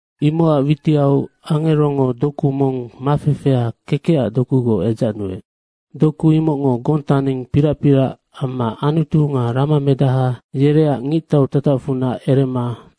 Imocac witiau angerongo doku mong mafefea kekecac dokugoc edzacnuec. Doku imocngo gontaning pirac pirac amma Anutu nga ramamedaha yereac ngictau tatacfunac erema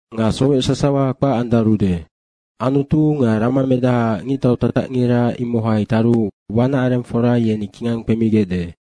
Nga sowec sasawa kpac andarude. Anutu nga ramamedahaac ngictau tatacngira imohai taru wanacarengfora ye kingang kpemigecde.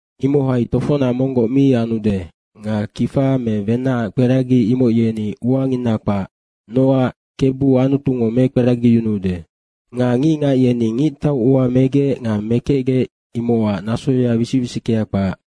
Imohai tofocnac monggoc mi anude nga kifa me wenacac kperagi imoc yeni uangina kpac, nocac Kebu Anutungo mekperagiyunuude. Nga ngicngac yeni ngictau ua megec nga mekecgec imocac nasoya wisic wisickea kpac.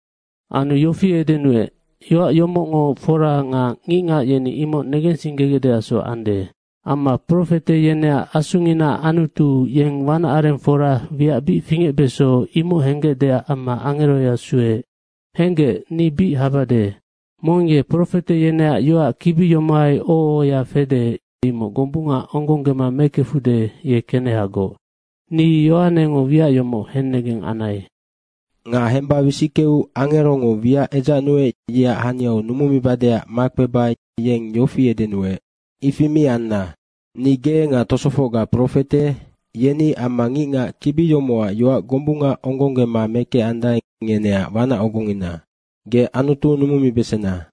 Anu yofi edenuec, “Yoac yomocngo fora nga ngicngac yeni imoc negensinggegecdeacsoc ande. Amma profete yeneac asunginaac Anutu, yeng wanacarengfora wiac bic fingecbeso, imoc henggecdeac amma angeroya sueec.” “Henggec, ni bic habade. Mong ye profete yeneac yoac kibi yomohai oho ohoya fede, imoc gombunga onggonggema mekefude, ye kenehagoc.” Ni Yohanengo wiac yomoc hennegeng anai. Nga hemba wisickeu angerongo wiac edzacnuec, yeac haniau numumibadeac makpeba yeng yofi edenuec, “Ifi mi anna. Ni ge nga tosofocga profete, yeni amma ngicngac kibi yomocac yoac gombunga onggonggema mekecandae, ngeneac wanac ogongina. Ge Anutu numumibesena.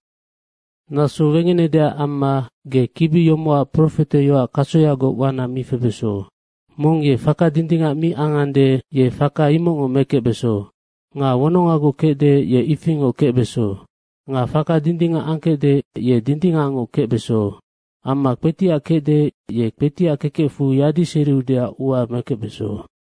Naso wegenedeac amma ge kibi yomocac profeteyoac kasoyagoc wana mi febeso. Mong ye faka dindingac mi angande, ye faka imocngoc mekecbeso. Nga wonongagoc kecde, ye ifingoc kecbeso. Nga faka dindingac angkecde, ye dindingacngoc kecbeso. Amma kpetiac kecde, ye kpetiac kekecfu yadiseriudeac ua mekecbeso.”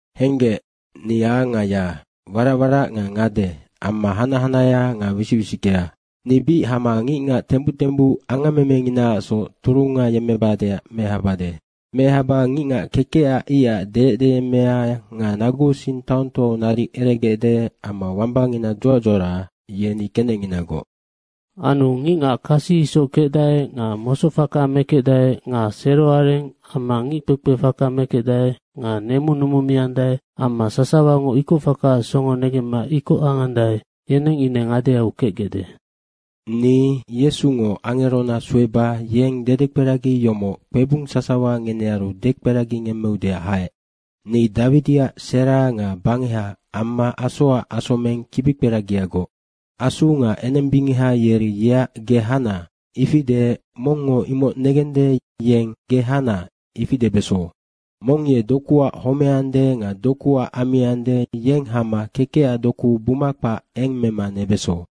“Henggec, ni A nga Y, warac warac nga ngade amma hanac hanahea nga wisic wisickea. Ni bic hama ngicngac tembuc tembuc angammemenginaacsoc turunga yemmebadeac mehabade. Mehaba ngicngac kekecac icac deyecdeyemmea nga naguusing taongtoau naric eregecde amma wambangina dzuac dzuara, yeni kenecnginagoc. Anu ngicngac kasi isoc kecdae nga mosocfaka mekecdae nga seroareng amma ngickpekpefaka mekecdae nga nemu numumiandae amma sasawango ikocfakaac songo negemma ikoc angandae, yeneng ine ngadeau kecgecde. Ni Yesungo angerona sueba yeng dedekperagi yomoc kpebung sasawa ngenearu dekperagingemmeudeac haec. Ni Dawidiac sera nga bangeha amma asoacac asomeng kibikperagiagoc.” Asu nga enembingeha yeri yeac, “Ge hana.” ifi deec mongngo imoc negende, yeng, “Ge hana.” ifi debeso. Mong ye dokuac homeande nga dokuac ammiande, yeng hama kekecac doku buma kpac eng mema nebeso.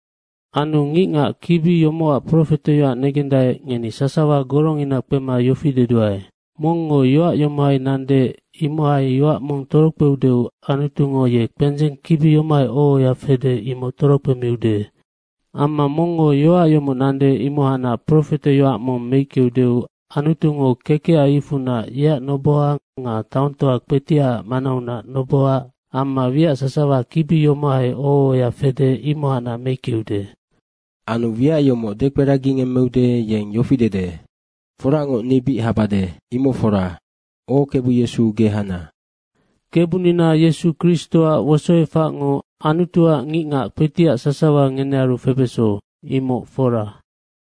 Anu ngicngac kibi yomocac profeteyoac negendae, ngeni sasawa gorongina kpema yofi deduae, “Mongngo yoac yomohai nande, imohai yoac mong torokpeudeu Anutungo ye kpendzeng kibi yomohai oho ohoya fede, imoc torokpemiude. Amma mongngo yoac yomoc nande, imohacnac profeteyoac mong meickeudeu Anutungo kekecac icfunac yeac noboha nga taongtoa kpetiacac manaunac noboha amma wiac sasawa kibi yomohai oho ohoya fede, imohacnac meickeude.” Anu wiac yomocac dekperagingemmeude, yeng yofi dede, “Foracngoc, ni bic habade.” Imoc fora. O Kebu Yesu, ge hana. Kebunina Yesu Kristoac wosoefacngo Anutuac ngicngac kpetiac sasawa ngenearu febeso, imoc fora.